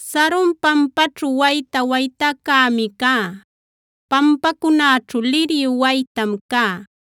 Saron pampaćhu wayta waytäcämi cá, pampacunäćhu liryu waytam cá.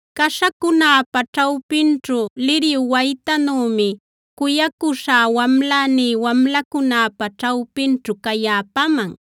Caśhacunäpa ćhawpinćhu liryu waytänümi cuyacuśhá wamläní wamlacunäpa ćhawpinćhu cayäpaman.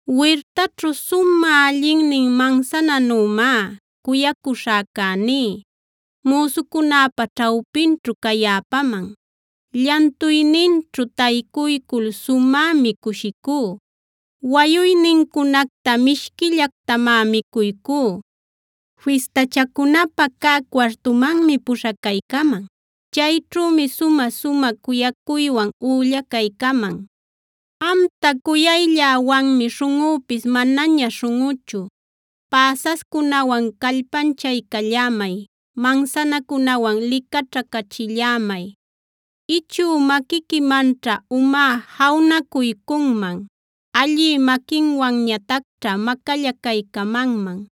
Wirtaćhu sumä allinnin mansananümá cuyacuśhäcäní müsucunäpa ćhawpinćhu cayäpaman. Llantuyninćhu taycuycul sumämi cushicú; wayuynincunacta mishquillactamá micuycú. Fistachacunapä cä cuartumanmi puśhacaycaman; chayćhümi sumä-sumä cuyacuywan üllacaycaman. Amta cuyaylläwanmi śhunꞌüpis manaña śhunꞌuchu, päsascunawan callpanchaycallämay; mansanacunawan licaćhacachillämay. Ichü maquiquimanćha umá jawnacuycunman; allï maquinwanñatacćha macallacaycamanman.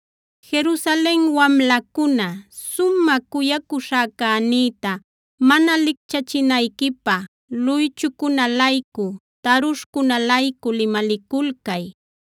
Jerusalen wamlacuna, sumä cuyacuśhäcänïta mana licchachinayquipä luychucunä-laycu, tarushcunä-laycu limaliculcay.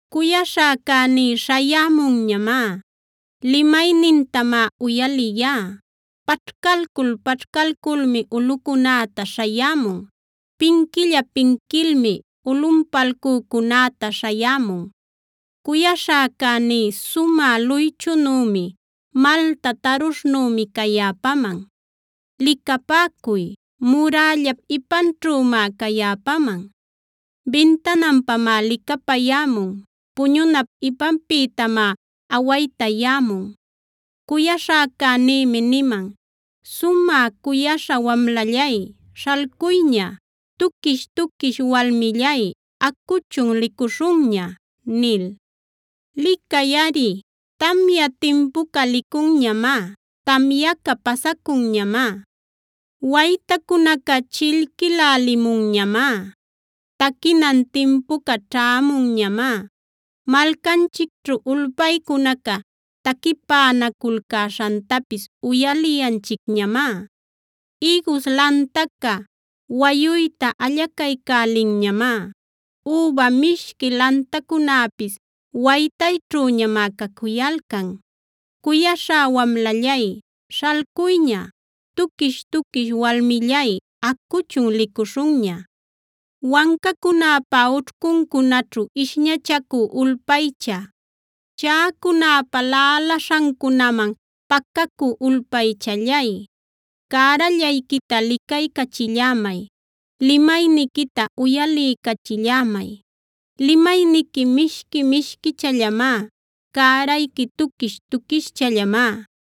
Cuyaśhäcäní śhayämunñamá. Limaynintamá uyaliyá. Paćhcalcul-paćhcalculmi ulꞌucunäta śhayämun; pinquilla-pinquilmi ulꞌunpalcücunäta śhayämun. Cuyaśhäcäní sumä luychunümi, malta tarushnümi cayäpaman. Licapäcuy, murällap ipanćhümá cayäpaman; bintananpamá licapayämun, puñunap ipanpïtamá awaytayämun. Cuyaśhäcänïmi niman: “Sumä cuyaśhá wamlallay, śhalcuyña. Tuquish-tuquish walmillay, acuchun licuśhunña” nil. Licayꞌari, tamya timpuca licunñamá; tamyaca pasacunñamá. Waytacunaca chillquïlalimunñamá, taquinan timpuca ćhämunñamá. Malcanchicćhu ulpaycunaca taquipänaculcäśhantapis uyaliyanchicñamá. Ïgus lantaca wayuyta allacaycälinñamá; üba mishqui lantacunäpis waytayćhüñamá cacuyalcan. Cuyaśhá wamlallay, śhalcuyña. Tuquish-tuquish walmillay, acuchun licuśhunña. Wancacunäpa ućhcuncunaćhu ishñachacü ulpaycha, chaꞌacunäpa laꞌalaśhancunaman pacacü ulpaychallay, cärallayquita licaycachillämay; limayniquita uyaliycachillämay. Limayniqui mishqui-mishquichallamá; cärayqui tuquish-tuquischallamá.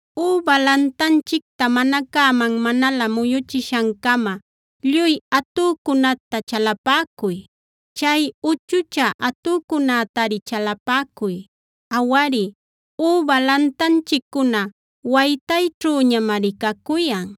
Üba lantanchicta mana cäman manalä muyuchishancama, lluy atücunäta chalapäcuy, chay uchuchä atücunätari chalapäcuy. Awari, üba lantanchiccuna waytayćhüñamari cacuyan.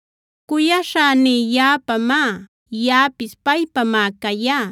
Cuyaśhäní yaꞌapamá; yaꞌapis paypamá cayá.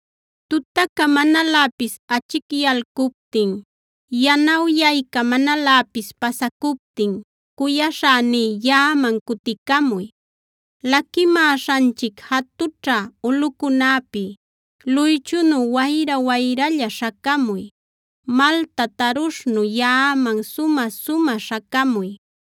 Tutaca manaläpis achicyalcuptin, yanawyayca manaläpis pasacuptin cuyaśhäní yaꞌaman cuticamuy. Laquimäśhanchic jatućhä ulꞌucunäpi luychunu wayra-wayralla śhacamuy; malta tarushnu yaꞌaman sumä-sumä śhacamuy.